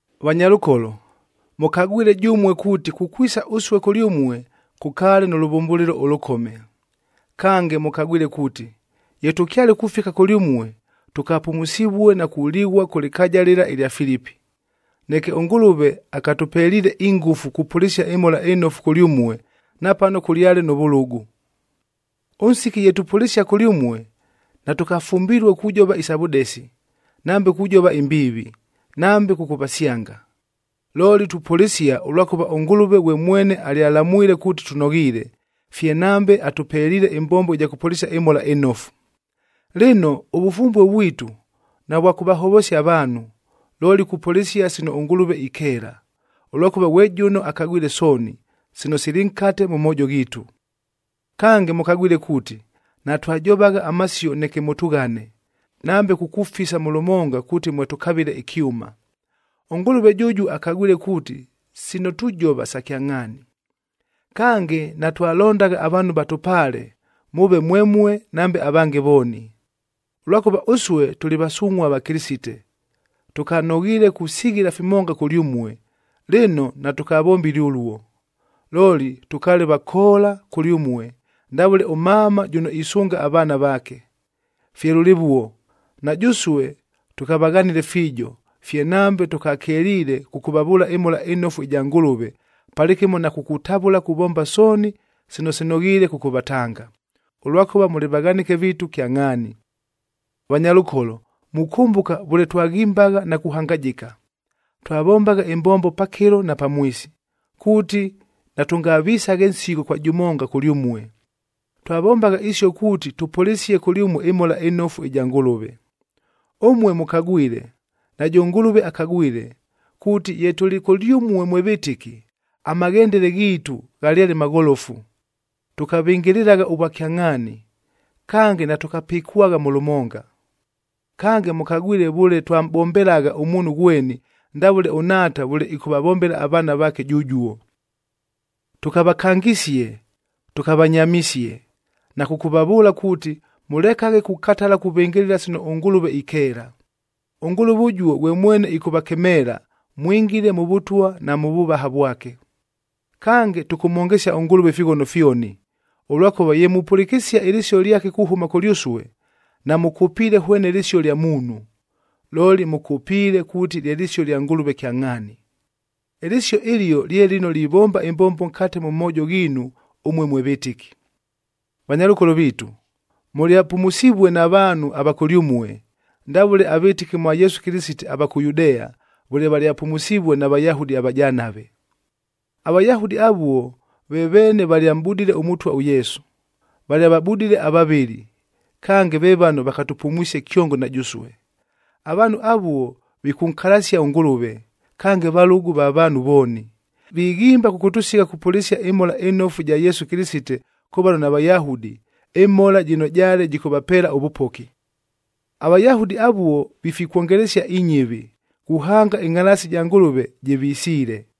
Vanyalʉkolo, mʉkagwile jʉmue kuuti kukwisa ʉsue kʉlyʉmue, kʉkaale nʉ lʉvʉmbʉlɨlo ʉlʉkome. Kange mʉkagwile kuuti, ye tʉkyale kufika kʉlyʉmue, tʉkapumusivue na kulighua kʉ lɨkaaja lɨla ɨlya Filipi. Neke ʉNgʉlʉve akatʉpeliile ingʉfu kupʉlɨsia ɨMhola ɨNofu kʉlyʉmue, napano kʉlyale nʉ vʉlʉgʉ. Ʉnsiki ye tupʉlɨsia kʉlyʉmue, natʉkafumbilue kujova isa vʉdesi, nambe kujova imbiivi, nambe kʉkʉvasyanga. Looli tupʉlɨsia ʉlwakʉva ʉNgʉlʉve ghwe mwene alyalamwile kuuti tʉnoghiile, fye nambe atʉpeliile ɨmbombo ɨja kʉpʉlɨsia ɨMhola ɨNofu. Lɨno, ʉvʉfumbue vwitu, navwa kʉvahovosia avaanhu, looli kupʉlɨsia sino ʉNgʉlʉve ikeela, ʉlwakʉva ghwe jʉno akagwile sooni, sino sili nkate mʉ moojo ghiitu. Kange mʉkagwile kuuti, natwajovagha amasio neke mʉtʉghane, nambe kukufisa mʉ lʉmonga kuuti mwe tʉkavɨle ɨkyʉma. ɄNgʉlʉve jʉjuo akagwile kuuti sino tujova sa kyangʼhaani. Kange, natwalondagha avaanhu vatʉpaale, mʉʉve mwemue, nambe avange vooni. Ʉlwakʉva ʉsue tʉlɨ vasungʼhua va Kɨlɨsite, tʉkanoghiile kusighila fimonga kʉlyʉmue, lɨno natʉkavombile ʉluo. Looli tʉkaale vakoola kʉlyʉmue ndavʉle ʉmama jʉno isʉnga avaana vaake. Fye lʉlɨvuo, na jʉsue tʉkavaghanile fiijo, fye nambe tʉkakeliile kʉkʉvavʉʉla ɨMhola ɨNofu ɨja Ngʉlʉve, palɨkɨmo na kukutavʉla kuvomba sooni sino sinoghiile kʉkʉvatanga, ʉlwakʉva mʉlɨ vaghanɨke viitu kyangʼhaani. Vanyalʉkolo! Mukʉmbʉka vʉle twaghimbagha na kuhangajɨka, twavombagha ɨmbombo pakɨlo na pamwisi, kuuti natʉngavisaghe nsigho kwa jʉmonga kʉlyʉmue. Twavombagha isio kuuti tʉpʉlɨsie kʉlyʉmue ɨMhola ɨNofu ɨja Ngʉlʉve. Ʉmue mʉkagwile, najʉ Ngʉlʉve akagwile, kuuti ye tʉlɨ kʉlyʉmue mwe vɨtɨki, amaghendele ghiitu ghalyale magholofu, tʉkavɨngɨlɨlagha ʉvwakyangʼhaani, kange natʉkapɨkwagha mʉ lʉmonga. Kange, mʉkagwile vʉle twamʼbombelagha ʉmuunhu ghweni, ndavʉle ʉnhaata vʉle ɨkʉvavombela avaana vaake jʉjuo. Tʉkavakangisie, tʉkavanyamisie, na kʉkʉvavʉʉla kuuti, mʉlekaghe kukatala kuvɨngɨlɨla sino ʉNgʉlʉve ikeela. ɄNgʉlʉve ʉjuo ghwe mwene ɨkʉvakemeela, mwingile mʉ Vʉtwa na mʉ vʉvaha vwake. Kange, tʉkʉmhongesia ʉNgʉlʉve ifighono fyoni, ʉlwakʉva ye mupʉlɨkɨsia ɨlɨsio lyake kuhʉma kʉlyʉsue, namʉkʉpiile hwene lɨsio lya muunhu, looli mʉkʉpiile kuuti lye lɨsio lya Ngʉlʉve kyangʼhaani. Ɨlɨsio ɨlio lye lɨno livomba ɨmbombo nkate mʉ moojo ghiinu ʉmue mwe vɨtɨki. Vanyalʉkolo viitu, mʉlyapumusivue na vaanhu ava kʉlyʉmue, ndavʉle avɨtɨki mwa Yesu Kɨlɨsite ava kʉ Yudea, vʉle valyapumusivue na Vayahudi avajanave. AVayahudi avuo, ve veene valyamʼbudile ʉMʉtwa ʉYesu, valyavabudile avavɨli, kange ve vano vakatʉpumwisie kyongo na jʉsue. Avaanhu avuo, vikʉnkalasia ʉNgʉlʉve, kange valʉgʉ va vaanhu vooni, vighimba kʉkʉtʉsigha kupʉlɨsia ɨMhola ɨNofu ɨja Yesu Kɨlɨsite kʉ vano naVayahudi, ɨMhola jɨno jaale jɨkʉvapeela ʉvʉpoki. AVayahudi avuo vifikwongelesia inyɨvi, kuhanga ɨngʼhalaasi ja Ngʉlʉve jɨvisiile!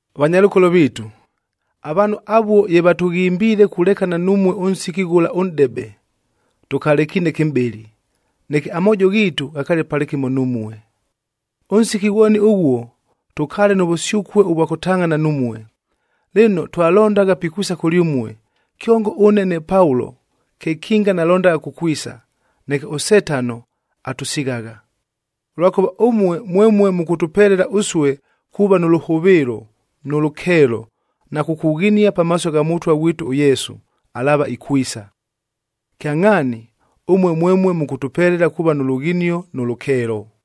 Vanyalʉkolo viitu, avaanhu avuo ye vatʉghimbiile kulekana numue ʉnsiki ghʉla ʉnʼdebe, tʉkalekiine kɨmʼbɨlɨ, neke amoojo ghiitu ghakaale palɨkɨmo numue. Ʉnsiki ghwoni ʉghuo, tʉkaale nʉ vʉsyʉkue ʉvwa kʉtangʼhana numue. Lɨno, twalondagha pikwisa kʉlyʉmue, kyongo ʉne ne Paulo kekinga nalondagha kukwisa, neke ʉSetano atʉsighagha. Ʉlwakʉva ʉmue mwemue mʉkʉtʉpelela ʉsue kuuva nʉ lʉhʉvɨɨlo, nʉ lʉkeelo, na kukughinia pamaaso gha Mʉtwa ghwitu ʉYesu, alaava ikwisa. Kyangʼhaani, ʉmue mwemue mʉkʉtʉpelela kuuva nʉ lughinio nʉ lʉkeelo.